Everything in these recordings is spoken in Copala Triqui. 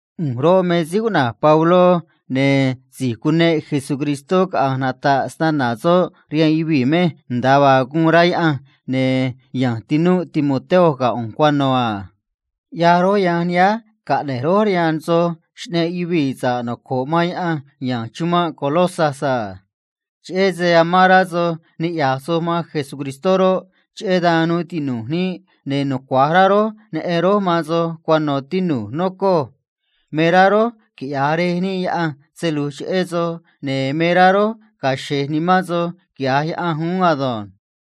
ꞌU̱nj roꞌ, me síí cuꞌna̱j Pabló, ne̱ si̱j cuneꞌ Cristó Jesús caꞌa̱nj nata̱ꞌ snana̱ soꞌ rihaan yuvii̱ mej nda̱a vaa guun rá Yaꞌanj, ne̱ ya̱nj tinúꞌ Timoteo ga̱ ꞌu̱nj cuano̱ a. ꞌYaj rój yanj nihánj caꞌne̱j rój rihaan nij soj xꞌneꞌ nij síí noco̱ꞌ man Yaꞌanj amán rá niꞌya̱j man Cristó ya̱nj chumanꞌ Colosas a. Cheꞌé se amán rá soj niꞌya̱j soj man Cristó roꞌ, cheꞌé dan nuu tinu̱j níꞌ, ne̱ nucua̱j rá rój neꞌen rój man soj cuano̱, tinu̱j, nocoj. Me rá rój quiꞌya̱j Rej níꞌ Yaꞌanj se lu̱j cheꞌé soj, ne̱ me rá rój ga̱a̱ xe̱j nimán soj, quiꞌya̱j Yaꞌanj uún ado̱nj.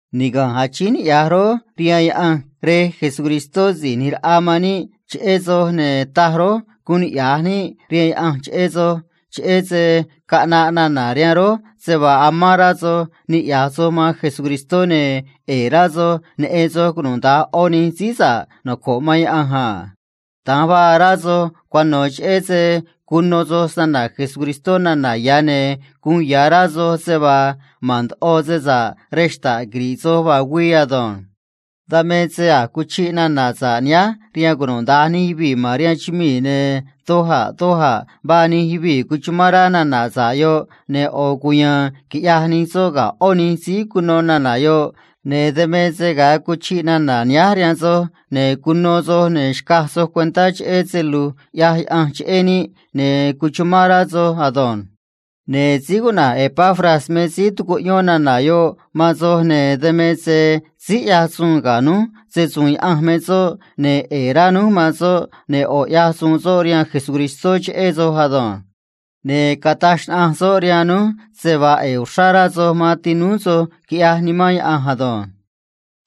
Niga̱nj achíín niꞌya̱j rój rihaan Yaꞌanj Rej Jesucristó Si̱j ꞌNi̱j Raꞌa man níꞌ cheꞌé soj, ne̱ taj rój guun niꞌya̱j níꞌ rihaan Yaꞌanj cheꞌé soj, cheꞌé se caꞌnaꞌ nana̱ rihaan rój se vaa amán rá soj niꞌya̱j soj man Cristó Jesús ne̱ ꞌe̱e̱ rá soj niꞌya̱j soj cunuda̱nj ꞌó nij síí noco̱ꞌ man Cristó a. Da̱nj vaa rá soj cuano̱, cheꞌé se cuno soj nana̱ sa̱ꞌ cheꞌé Cristó nana̱ ya̱, ne̱ uun ya̱ rá soj se vaa ma̱n ndoꞌo se sa̱ꞌ rej xta̱ꞌ quiri̱ꞌ soj vaa güii ado̱nj. Dan me se a̱j cuchiꞌ nana̱ sa̱ꞌ nihánj rihaan cunuda̱nj nij yuvii̱ ma̱n rihaan chumii̱, ne̱ doj a̱ doj a̱ vaa nij yuvii̱ cuchumán rá nana̱ sa̱ꞌ yoꞌ a. Ne̱ ꞌo̱ cuya̱a̱n quiꞌyaj nij soj ga̱ ꞌó nij síí cuno nana̱ yoꞌ, ne̱ dan me se ga̱a cuchiꞌ nana̱ nihánj rihaan soj, ne̱ cuno soj, ne̱ xcaj soj cuentá cheꞌé se lu̱j ꞌyaj Yaꞌanj cheꞌé níꞌ, ne̱ cuchumán rá soj ado̱nj. Ne̱ síí cuꞌna̱j Epafras me síí tucuꞌyón nana̱ yoꞌ man soj, ne̱ dan me se síí ꞌyaj se‑su̱u̱n Yaꞌanj ga̱ núj me soꞌ, ne̱ ꞌe̱e̱ rá núj man soꞌ, ne̱ ꞌo̱ ꞌyaj soꞌ se‑su̱u̱n Cristó cheꞌé soj ado̱nj. Ne̱ cataj xnaꞌanj soꞌ rihaan núj se vaa ꞌe̱e̱ uxrá rá soj man tinúú soj, quiꞌyaj Nimán Yaꞌanj ado̱nj.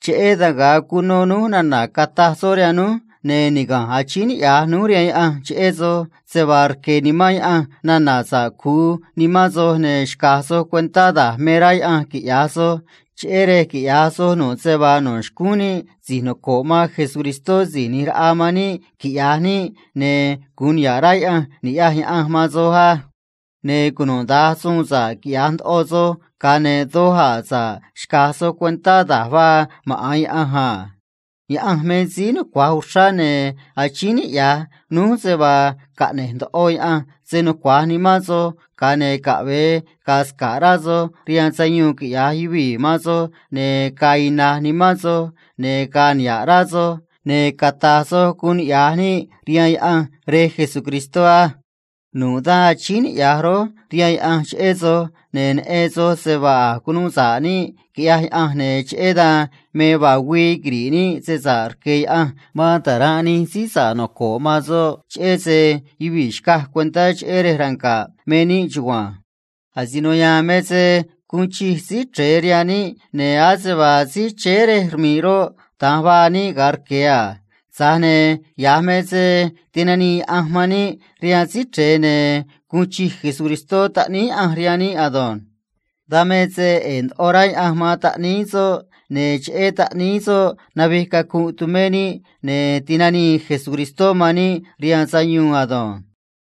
Cheꞌé dan asi̱j cuno núj nana̱ cataj soꞌ rihaan núj, ne̱ niga̱nj achíín niꞌya̱j núj rihaan Yaꞌanj cheꞌé soj se vaa rque̱ Nimán Yaꞌanj nana̱ sa̱ꞌ cu̱u nimán soj, ne̱ xca̱j soj cuentá da̱j me rá Yaꞌanj quiꞌya̱j soj, cheꞌé rej quiꞌya̱j soj nu̱ꞌ se vaa no̱ xcúún níꞌ si̱j noco̱ꞌ man Síí ꞌNi̱j Raꞌa man níꞌ quiꞌya̱j níꞌ, ne̱ gu̱un niha̱ꞌ rá Yaꞌanj ni̱ꞌyaj Yaꞌanj man soj á. Ne̱ cunuda̱nj suun sa̱ꞌ quiꞌya̱j ndoꞌo soj, ga̱a ne̱ doj a̱ sa̱ꞌ xca̱j soj cuentá da̱j vaa maꞌa̱n Yaꞌanj a. Yaꞌanj me síí nucua̱j uxrá, ne̱ achíín niꞌya̱j núj se vaa caꞌne̱j ndoꞌo Yaꞌanj se nucua̱j nimán soj, ga̱a ne̱ caꞌve̱e ga̱a̱ sca̱ꞌ rá soj rihaan sayuun quiꞌya̱j yuvii̱ man soj, ne̱ ga̱a̱ ina̱j nimán soj, ne̱ ga̱a̱ niha̱ꞌ nimán soj, ne̱ cata̱j soj guun niꞌya̱j níꞌ rihaan Yaꞌanj Rej Jesucristó á. Nu̱ꞌ dan achíín niꞌya̱j rój rihaan Yaꞌanj cheꞌé soj, ne̱ neꞌen soj se vaa a̱j cunuu sa̱ꞌ níꞌ quiꞌyaj Yaꞌanj, ne̱ cheꞌé dan me vaa güii quiri̱ꞌ níꞌ se sa̱ꞌ rque̱ Yaꞌanj man ta̱ranꞌ nij síí noco̱ꞌ man soꞌ, cheꞌé se yuvii̱ xcaj cuentá chéé rej ranga̱ꞌ me níꞌ chugua̱nj. Asino ya̱a̱n me se guun chij Síí Chre̱e rihaan níꞌ, ne̱ ase vaa síí chéé rej rmi̱ꞌ roꞌ, da̱nj vaa níꞌ ga̱a rque̱ a. Tza̱j ne̱ ya̱j me se tinanii Yaꞌanj man níꞌ rihaan Síí Chre̱e, ne̱ ya̱j uun chij Taꞌníí Yaꞌanj rihaan níꞌ quiꞌyaj Yaꞌanj ado̱nj. Dan me se ꞌe̱e̱ ndoꞌo rá Yaꞌanj man Taꞌníí soꞌ, ne̱ cheꞌé Taꞌníí soꞌ navij cacunꞌ tumé níꞌ, ne̱ ti̱nanii Taꞌníí soꞌ man níꞌ rihaan sayuun ado̱nj.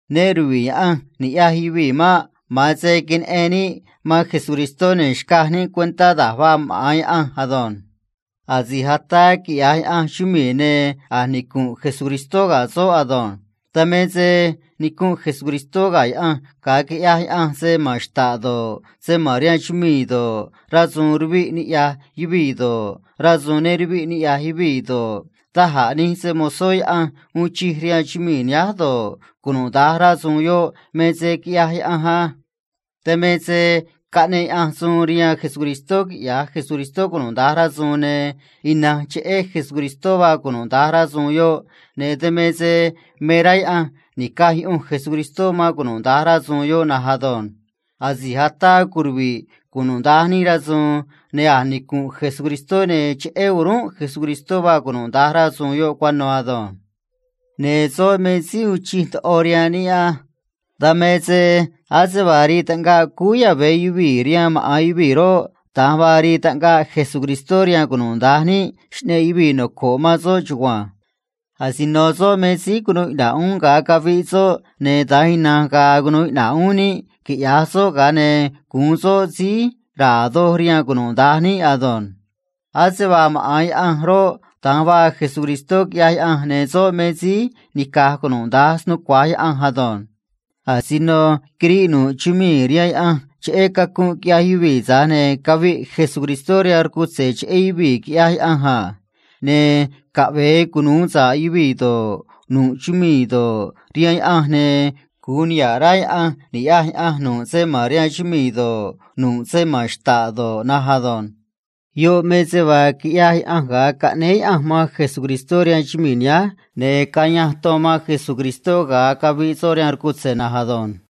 Ne ruviꞌ Yaꞌanj niꞌya̱j yuvii̱ maꞌ. Ma̱an se queneꞌen níꞌ man Cristó, ne̱ xcaj níꞌ cuentá da̱j vaa maꞌa̱n Yaꞌanj ado̱nj. Asi̱j ataa quiꞌya̱j Yaꞌanj chumii̱, ne̱ a̱j nicu̱nꞌ Cristó ga̱ soꞌ ado̱nj. Dan me se nicu̱nꞌ Cristó ga̱ Yaꞌanj ga̱a quiꞌyaj Yaꞌanj se ma̱n xta̱ꞌ do̱ꞌ, se ma̱n rihaan chumii̱ do̱ꞌ, rasu̱u̱n ruviꞌ niꞌya̱j yuvii̱ do̱ꞌ, rasu̱u̱n ne ruviꞌ niꞌya̱j yuvii̱ do̱ꞌ, da̱j a̱ nij se‑mo̱zó Yaꞌanj uun chij rihaan chumii̱ nihánj do̱ꞌ, cunuda̱nj rasu̱u̱n yoꞌ me se quiꞌyaj Yaꞌanj á. Dan me se caꞌneꞌ Yaꞌanj suun rihaan Cristó quiꞌya̱j Cristó cunuda̱nj rasu̱u̱n, ne̱ ina̱nj cheꞌé Cristó vaa cunuda̱nj rasu̱u̱n yoꞌ, ne̱ dan me se me rá Yaꞌanj ni̱caj yuꞌunj Cristó man cunuda̱nj rasu̱u̱n yoꞌ na̱nj ado̱nj. Asi̱j ataa curuvi̱ꞌ cunuda̱nj nij rasu̱u̱n, ne̱ a̱j nicu̱nꞌ Cristó, ne̱ cheꞌé o̱rúnꞌ Cristó vaa cunuda̱nj rasu̱u̱n yoꞌ cuano̱ ado̱nj. Ne̱ soꞌ me síí uun chij ndoꞌo rihaan níꞌ á. Dan me se ase vaa rii taꞌngaꞌ cúú yave̱ yuvii̱ rihaan maꞌa̱n yuvii̱ roꞌ, da̱nj vaa rii taꞌngaꞌ Cristó rihaan cunuda̱nj níꞌ xꞌneꞌ yuvii̱ noco̱ꞌ man soꞌ chugua̱nj. Asino soꞌ me síí cunuu iꞌna̱ꞌ uún ga̱a caviꞌ soꞌ, ne̱ da̱nj ina̱nj ga̱a̱ cunu̱u iꞌna̱ꞌ uún níꞌ, quiꞌya̱j soꞌ, ga̱a ne̱ gu̱un soꞌ síí ra̱a̱ doj rihaan cunuda̱nj níꞌ ado̱nj. Ase vaa maꞌa̱n Yaꞌanj roꞌ, da̱nj vaa Cristó, quiꞌyaj Yaꞌanj, ne̱ soꞌ me síí nica̱j cunuda̱nj snucua̱j Yaꞌanj ado̱nj. Asino quiriꞌ nu̱ꞌ chumii̱ rihaan Yaꞌanj cheꞌé cacunꞌ quiꞌyaj yuvii̱, tza̱j ne̱ caviꞌ Cristó rihaan rcutze̱ cheꞌé yuvii̱, quiꞌyaj Yaꞌanj a. Ne̱ caꞌve̱e cunu̱u sa̱ꞌ yuvii̱ do̱ꞌ, nu̱ꞌ chumii̱ do̱ꞌ, rihaan Yaꞌanj, ne̱ gu̱un niha̱ꞌ rá Yaꞌanj ni̱ꞌyaj Yaꞌanj nu̱ꞌ se ma̱n rihaan chumii̱ do̱ꞌ, nu̱ꞌ se ma̱n xta̱ꞌ do̱ꞌ na̱nj ado̱nj. Yoꞌ me se vaa quiꞌyaj Yaꞌanj ga̱a caꞌnéé Yaꞌanj man Cristó rihaan chumii̱ nihánj ne̱ cayanj ton man Cristó ga̱a caviꞌ soꞌ rihaan rcutze̱ na̱nj ado̱nj.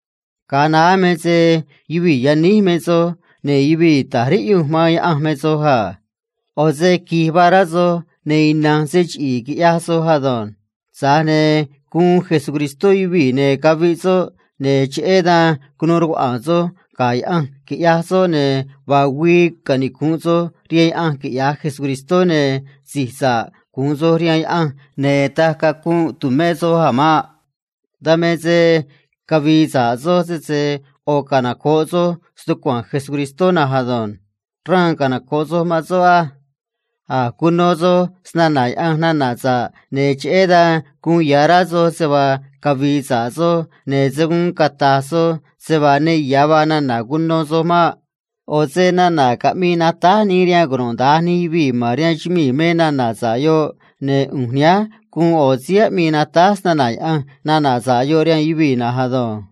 Ga̱a naá me se yuvii̱ yaníj me soj, ne̱ yuvii̱ ta̱j riꞌyunj man Yaꞌanj me soj a. ꞌO̱ se qui̱j vaa rá soj, ne̱ ina̱nj se chiꞌi̱i̱ quiꞌyaj soj ado̱nj. Tza̱j ne̱ guun Cristó yuvii̱, ne̱ caviꞌ soꞌ, ne̱ cheꞌé dan cunuu rcuaꞌa̱a̱n soj ga̱ Yaꞌanj, quiꞌyaj soꞌ, ne̱ vaa güii canicu̱nꞌ soj rihaan Yaꞌanj, quiꞌya̱j Cristó, ne̱ si̱j nuu sa̱ꞌ nimán rihaan Yaꞌanj gu̱un soj, ne̱ taj cacunꞌ tu̱mé soj a̱ maꞌ. Dan me se cavi̱i̱ sa̱ꞌ soj, sese ꞌo̱ canoco̱ꞌ soj stucua̱nj Cristó na̱nj ado̱nj. Raan canoco̱ꞌ soj man soꞌ á. A̱j cuno soj nana̱ sa̱ꞌ cheꞌé Cristó, ne̱ cheꞌé dan uun ya̱ rá soj se vaa cavi̱i̱ sa̱ꞌ soj, ne̱ se̱ guun cata̱j soj se vaa ne ya̱ vaa nana̱ sa̱ꞌ cuno soj maꞌ. ꞌO̱ se nana̱ caꞌmii natáj nii rihaan cunuda̱nj nij yuvii̱ ma̱n rihaan chumii̱ me nana̱ sa̱ꞌ yoꞌ, ne̱ ꞌu̱nj nihánj guun ꞌo̱ síí aꞌmii natáj snana̱ Yaꞌanj nana̱ sa̱ꞌ yoꞌ rihaan yuvii̱ na̱nj ado̱nj.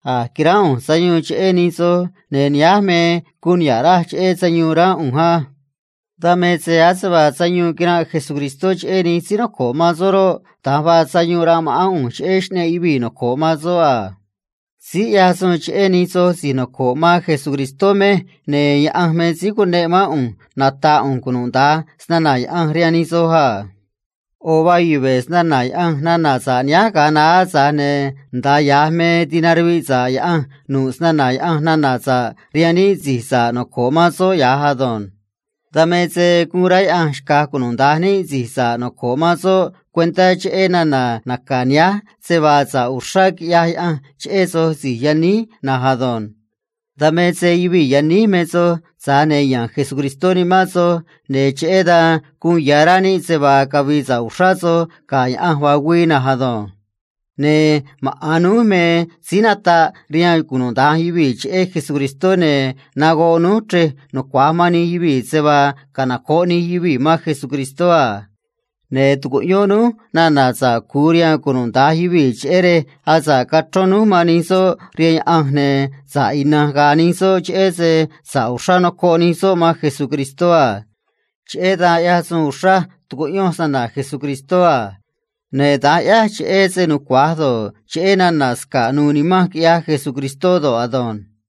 A̱j quiránꞌ ꞌu̱nj sayuun cheꞌé nij soj, ne̱ nihánj me guun niha̱ꞌ raj cheꞌé sayuun ránꞌ ꞌu̱nj á. Dan me se ase vaa sayuun quiranꞌ Cristó cheꞌé nij síí noco̱ꞌ man soꞌ roꞌ, da̱nj vaa sayuun ranꞌ ma̱ꞌán ꞌu̱nj cheꞌé xꞌneꞌ yuvii̱ noco̱ꞌ man soꞌ a. Síí ꞌyaj se‑su̱u̱n Yaꞌanj cheꞌé nij soj si̱j noco̱ꞌ man Cristó mej, ne̱ Yaꞌanj me síí cuneꞌ mán ꞌu̱nj nata̱ꞌ ꞌu̱nj cunuda̱nj snana̱ Yaꞌanj rihaan nij soj a. ꞌO̱ vaa yuve̱ snana̱ Yaꞌanj nana̱ sa̱ꞌ nihánj ga̱a naá, tza̱j ne̱ nda̱a ya̱j me tinaruviꞌ sa̱ꞌ Yaꞌanj nu̱ꞌ snana̱ Yaꞌanj nana̱ sa̱ꞌ rihaan níꞌ si̱j noco̱ꞌ man soꞌ ya̱j ado̱nj. Dan me se guun rá Yaꞌanj xca̱j cunuda̱nj níꞌ si̱j noco̱ꞌ man soꞌ cuentá cheꞌé nana̱ sa̱ꞌ yuve̱ nihánj nana̱ tihaa̱n naca̱ Yaꞌanj se vaa niꞌndaj ya̱ sa̱ꞌ quiꞌyaj Yaꞌanj cheꞌé soj si̱j yaníj na̱nj ado̱nj. Dan me se yuvii̱ yaníj me soj, tza̱j ne̱ ya̱nj Cristó nimán soj, ne̱ cheꞌé dan uun ya̱ rá níꞌ se vaa niꞌndaj ya̱ cavi̱i̱ sa̱ꞌ soj ga̱ Yaꞌanj vaa güii na̱nj ado̱nj. Ne̱ maꞌa̱n núj me síí nataꞌ rihaan cunuda̱nj yuvii̱ cheꞌé Cristó, ne̱ nagoꞌ núj chrej nucua̱j man nij yuvii̱ se vaa canoco̱ꞌ nij yuvii̱ man Cristó a. Ne̱ tucuꞌyón núj nana̱ sa̱ꞌ cu̱u rihaan cunuda̱nj yuvii̱, cheꞌé rej asa̱ꞌ cachrón núj man nij soꞌ rihaan Yaꞌanj, ne̱ sa̱ꞌ ina̱nj ga̱a̱ nij soꞌ, cheꞌé se sa̱ꞌ uxrá nocoꞌ nij soꞌ man Cristó a. Cheꞌé dan ꞌyaj uxraj se‑su̱u̱n Cristó cheꞌé se nucua̱j do̱ꞌ, cheꞌé nana̱ sca̱ꞌ do̱ꞌ, nu̱u̱ nimanj quiꞌyaj Cristó ado̱nj.